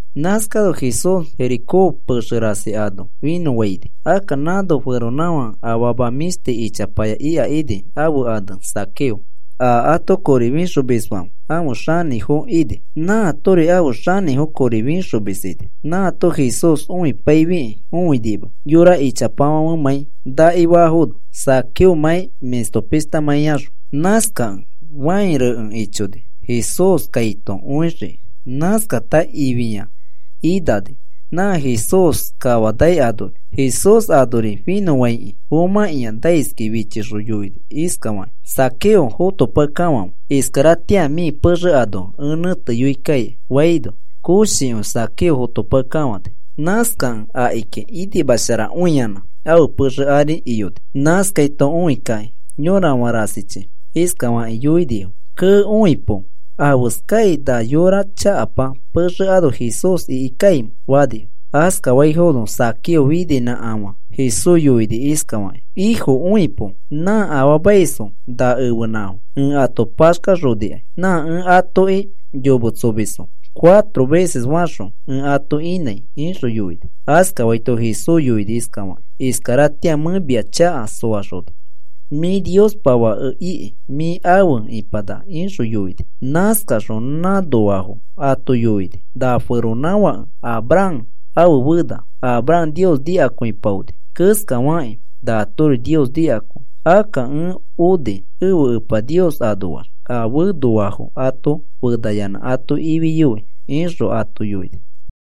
Nãskano Jesús Jericó pexe rasi ano finõfaini. Akka nãno feronãfake afama mĩshti ichapaya ika ini, ãfe ane Zaqueo. A ato kori fixomisfãfe ãfe xanĩfo ini. Nãatori ãfe xanĩfo kori fixomis ini. Nãato Jesús õipaifiki õinima, yora ichapafãfemãi nakifafono Zaqueomãi mĩsto pishtamãi axõ. Nãskakẽ fãi rekẽ ichoni Jesús kaito õixiki. Nãskata ĩfiya inani nã Jesús kafanai anori. Jesús anori finõfãikĩ fomãkĩa naiskĩ fichixõ yoini iskafaki: “Zaqueo, fotopakekafãfe. Iskaratĩa mĩ pexe ano ẽ nẽteyoikaikai,” faino, koshikõi Zaqueo fotopakekafãni. Nãskakẽ akiki inimasharakõiyanã ãfe pexe ari iyoni. Nãskaito õikakĩ yora rasichi iskafakĩ yoinifo: “¡Kee, õikapo! ¿Afeskai na yora chakapa pexe ano Jesús iki kaimẽ?” fanifo. Askafafiaifono Zaqueo fininãkafã Jesús yoini iskafakĩ: “Ifo, õipo. Nã afaamaisfo na ẽfenãfo ẽ ato paxkaxonikai. Nã ẽ atoki yometsomisfo cuatro veces faxõ ẽ ato inãi,” ixõ yoini. Askafaito Jesús yoini iskafaki: “Iskaratĩa mẽ mia chaka soaxona mĩ Niospa fake iki mĩ afe ĩpanaka,” ixõ yoini. Nãskaxõ nãnoafo ato yoini: “Na feronãfake Abraham ãfe fena. Abraham Nios nikakõipaoni keskafakĩ natori Nios nikakõi. Akka ẽ oni ẽfe Epa Nios anoax a fenoafo ato fenayanã ato ifiyoi,” ixõ ato yoini.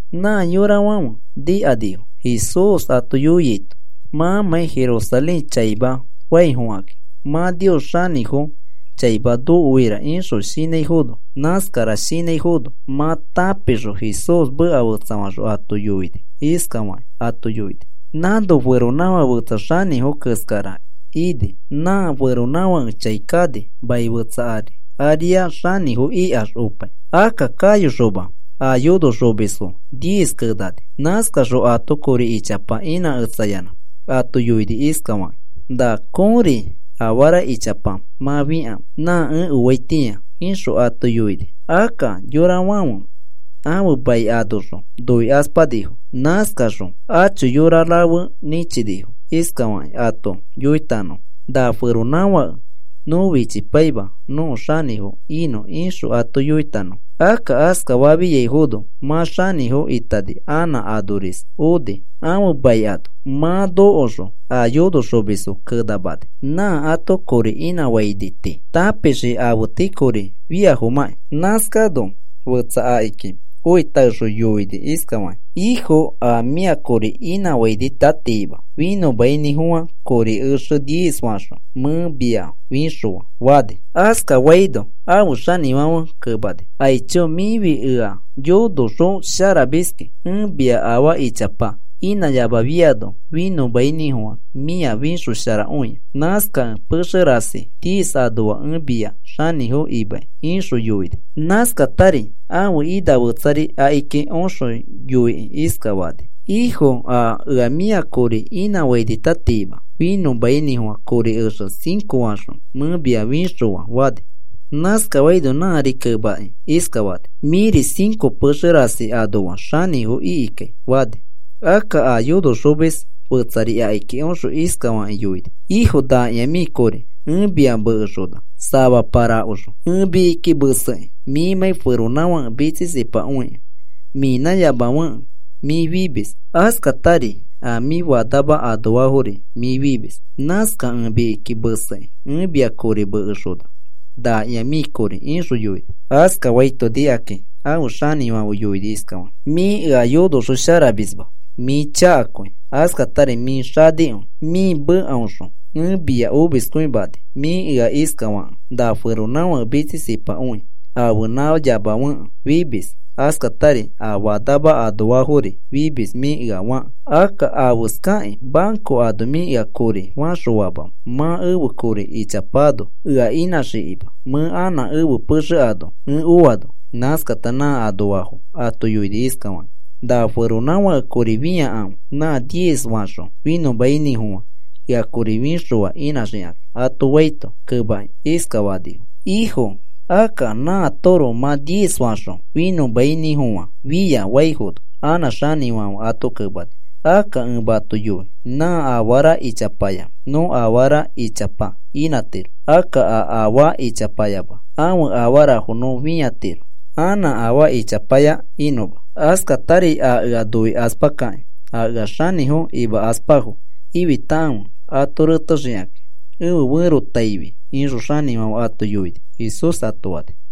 Nã yorafãfe nikanifo Jesús ato yoiaito mãmãi Jerusalén chaima faifokakĩ, “Mã Nios xanĩfo chaima nokoira,” ixõ shinãifono. Nãskara shinãifono mã tãpixõ Jesús meka fetsafaxõ ato yoini. Iskafakĩ ato yoini: “Nãno feronãfake fetsa xanĩfo keskara ini. Nã feronãfake chai kani mai fetsa ari, nãriax mã xanĩfo ikax opai. Akka kayoxoma a yonoxomisfo diez kenani. Nãskaxõ ato kori ichapa inãketsayanã ato yoini iskafakĩ: ‘Na kõri afara ichapa mã fĩkãfe nã ẽ oaitĩa,’ ixõ ato yoini. Akka yorafãfe ãfe mai anoxõ noikaspanifo. Nãskaxõ acho yora rafe nĩchinifo iskafakĩ ato yoitanõfo: ‘Na feronãfake nõ fichipaima nõko xanĩfo inõ,’ ixõ ato yoitanõfo. “Akka askafafiaifono mã xanĩfo itani anã anoris oni ãfe mai ano. Mã nokoxõ a yonoxomisfo kenamani nã ato kori inãfaini tii, tãpixiki afe tii kori fiafomãkĩ. Nãskano fetsa akiki oitaexõ yoikĩ iskafani: ‘Ifo, a ea mĩa kori inãfainitatima finõmainĩfofã kori exe diez faxõ mẽ mia fĩxõa,’ fani. Askafaino ãfe xanĩfãfe kemani: ‘Aicho, mĩfi ea yonoxõ sharamiski. Ẽ mia afaa ichapa inãyamafiano finõmainĩfofã mĩa fĩxosharakõia. Nãskakẽ pexe rasi diez anoa ẽ mia xanĩfo imai,’ ixõ yoini. Nãskatari ãfe ina fetsari akiki oxõ yoikĩ iskafani: ‘Ifo, a ea mĩa kori inãfainitatima finõmainĩfofã kori exe cinco faxõ mẽ mia fixõa,’ fani. Nãskafaino nãri kemakĩ iskafani: ‘Mĩri cinco pexe rasi anoa xanĩfo ikikai,’ fani. Akka a yonoxomis fetsari akiki oxõ iskafakĩ yoini: ‘Ifo, nakĩa mĩ kori ẽ mia mekexona samapa rakoxõ. Ẽ mikiki mesekĩ, mĩmãi feronãfake mitsisipakõikẽ, mĩnãyamafekẽ mĩ fimis, askatari a mĩ fanama anoafori mĩ fimis. Nãskakẽ ẽ mikiki mesekĩ ẽ mia kori mekexona, nakĩa mĩ kori,’ ixõ yoini. “Askafaito nikakĩ ãfe xanĩfãfe yoini iskafakĩ: ‘Mĩ ea yonoxosharamisma, mĩ chakakõi, askatari mĩ xanikõi. Mĩ mekaõxõ ẽ mia omiskõimani. Mĩ ea iskafakẽ, na feronãfake mitsisipakõi ãfenãyamafekẽ fimis, askatari a fanama anoafori fimis mĩ ea fakẽ. Akka, ¿afeskakĩ banco ano mĩ ea kori faxõfamamẽ mã ẽfe kori ĩchapano ea inãxikima, mẽ anã ẽfe pexe ano ẽ oano?’ Nãskata nã anoafo ato yoini iskafakĩ: ‘Na feronãfake kori fĩakãfe nã diez faxõ finõmainĩfofã ea kori fixõa inãxikakĩ,’ ato faito, kemakĩ iskafanifo: ‘Ifo, akka nãatoroko mã diez faxõ finõmainĩfofã fia,’ faifono, anã xanĩfãfe ato kemani: ‘Akka ẽ mato yoi nã afara ichapaya nõ afara ichapa inãtiro. Akka a afaa ichapayama, ãfe afara nõ fĩatiro anã afaa ichapaya inõma. Askatari a ea noikaspakakĩ a ea xanĩfo fakaspafo, fitakãfe ato retexikakĩ ẽfe ferotaifi,’ ixõ xanĩfãfe ato yoini,” Jesús ato fani.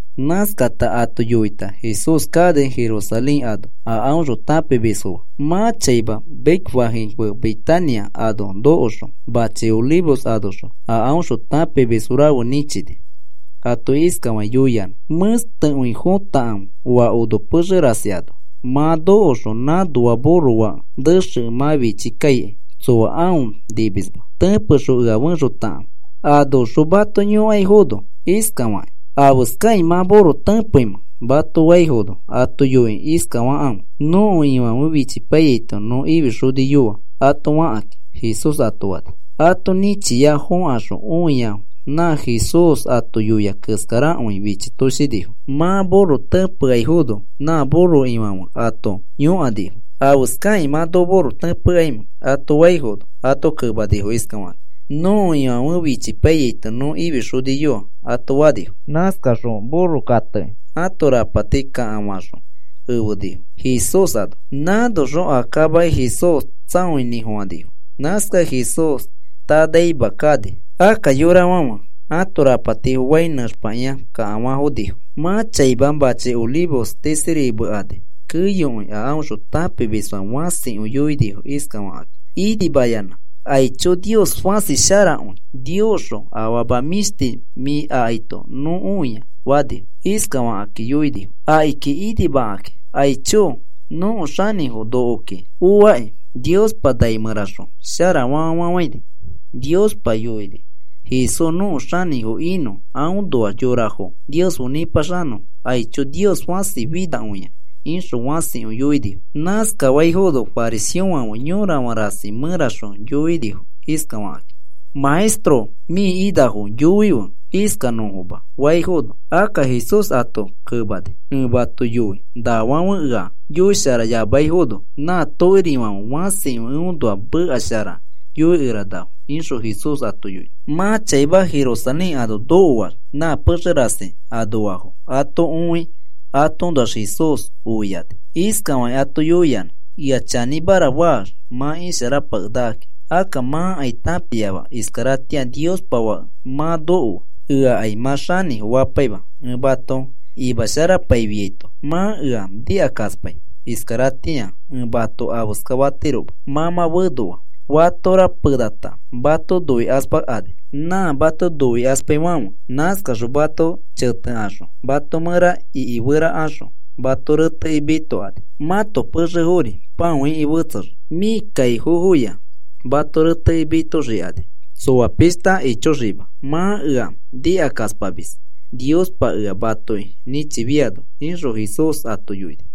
Nãskara ato yoita Jesús kani Jerusalén ano a aõxõ tãpimisfo fe. Mã chaima Betfagé fe Betania ano nokoxõ machi Olivos anoxõ a aõxõ tãpimis rafe nĩchini. Ato iskafakĩ yoiyanã: “Mẽstekõi fõtakãfe oa ono pexe rasi ano. Mã nokoxõ nãnoa burro fake nexekẽ mã fichi kaikai tsoa aõ nimisma. Tẽpexõ ea efexotakãfe. Anoxõ mato yõkaifono iskafakĩ: ‘¿Afeskakĩ mã burro tẽpeimẽ?’ mato faifono ato yoikĩ iskafakãfe: ‘Nõko Ifãfe fichipaiyaito nõ ifixoniyoa,’ ato fakakĩ,” Jesús ato fani. Ato nĩchia fõkaxõ õiafo nã Jesús ato yoia keskarakõi fichitoshinifo. Mã burro tẽpeaifono, nã burro ifofãfe ato yõkanifo: “¿Afeskakĩ mã noko burro tẽpekaimẽ?” ato faifono, ato kemanifo iskafakakĩ: “Nõko Ifãfe fichipaiyaito nõ ifixoniyoa,” ato fanifo. Nãskaxõ burro kateki ãto rapati kakafakaxõ efenifo Jesús ano. Nãskaxõ a kamaki Jesús tsaoinĩfofãnifo. Nãskakẽ Jesús tanaima kani. Akka yorafãfe ãto rapatifo fai nẽxpakĩa kakafafonifo. Mã chaima machi Olivos tisiri mekani keyokõi a aõxõ tãpimisfãfe fãsikõi yoinifo iskafakakĩ inimayanã: “¡Aicho, Nios fãsi sharakõi! ¡Niosxõ afama mĩshti mĩ akaito nõ oia!” fanifo. Iskafakĩ yoinifo akiki inimakakĩ: “¡Aicho, nõko xanĩfo nokoki oaki! ¡Niospa nai mẽraxõ shara famafafãini! ¡Niospa yoini Jesús nõko xanĩfo inõ, aõnoax yorafo Nios fe nĩpaxanõfo! ¡Aicho, Nios fãsi finakõia!” ixõ fãsikõi yoinifo. Nãskafaifono fariseofãfe yorafã rasi mẽraxõ yoinifo iskafakakĩ: “Maestro, mĩ inafo yoife iskanõfoma,” faifono, akka Jesús ato kemani: “Ẽ mato yoi nafãfe ea yoisharayamaifono, na tokirifãfe fãsikõi eõnoa meka shara yoikeranafo,” ixõ Jesús ato yoini. Mã chaima Jerusalén ano nokoax nã pexe rasi anoafo ato õi, atoõnoax Jesús oiani. Iskafakĩ ato yoiyanã: “Ea chanĩmara faax mã isharapakenakaki. Akka mãkai tãpiama iskaratĩa Niospa Fake mã nokoa. Eakai mã xanĩfo fapaima ẽ mato imasharapaifiaito, mã ea nikakaspai. Iskaratĩa ẽ mato afeskafatiroma. Mã mã fenoa. Fatora penata mato noikaspakani nã mato noikaspaifãfe. Nãskaxõ mato chetekaxõ mato mẽra ikiferakaxõ mato retekĩ mitokani. Mãto pexefori pãoiki fetsexii, mĩ kaifofoya mato retekĩ mitoxikani tsoa pishta ichoxima, mã ea nikakaspamis Niospa ea matoki nĩchifiano,” ixõ Jesús ato yoini.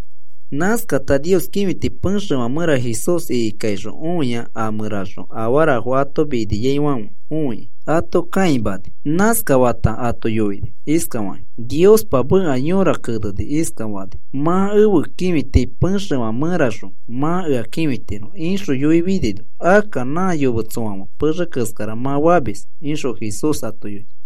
Nãskata Nios kĩfiti pexefã mẽra Jesús ikikaixõ õia a mẽraxõ afarafo ato miniaifãfe õikĩ ato kãimani. Naskafata ato yoini iskafakĩ: “Niospa meka yõra kenekĩ iskafani: ‘Mã ẽfe kĩfiti pexefã mẽraxõ mã ea kĩfitiro,’ ixõ yoifinino, akka nã yometsofãfe pexe keskara mã famis,” ixõ Jesús ato yoini.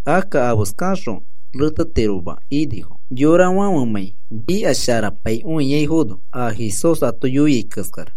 Akka afeskaxõ retetiroma inifo, yorafãfemãi nikasharapaikõiaifono a Jesús ato yoiai keskara.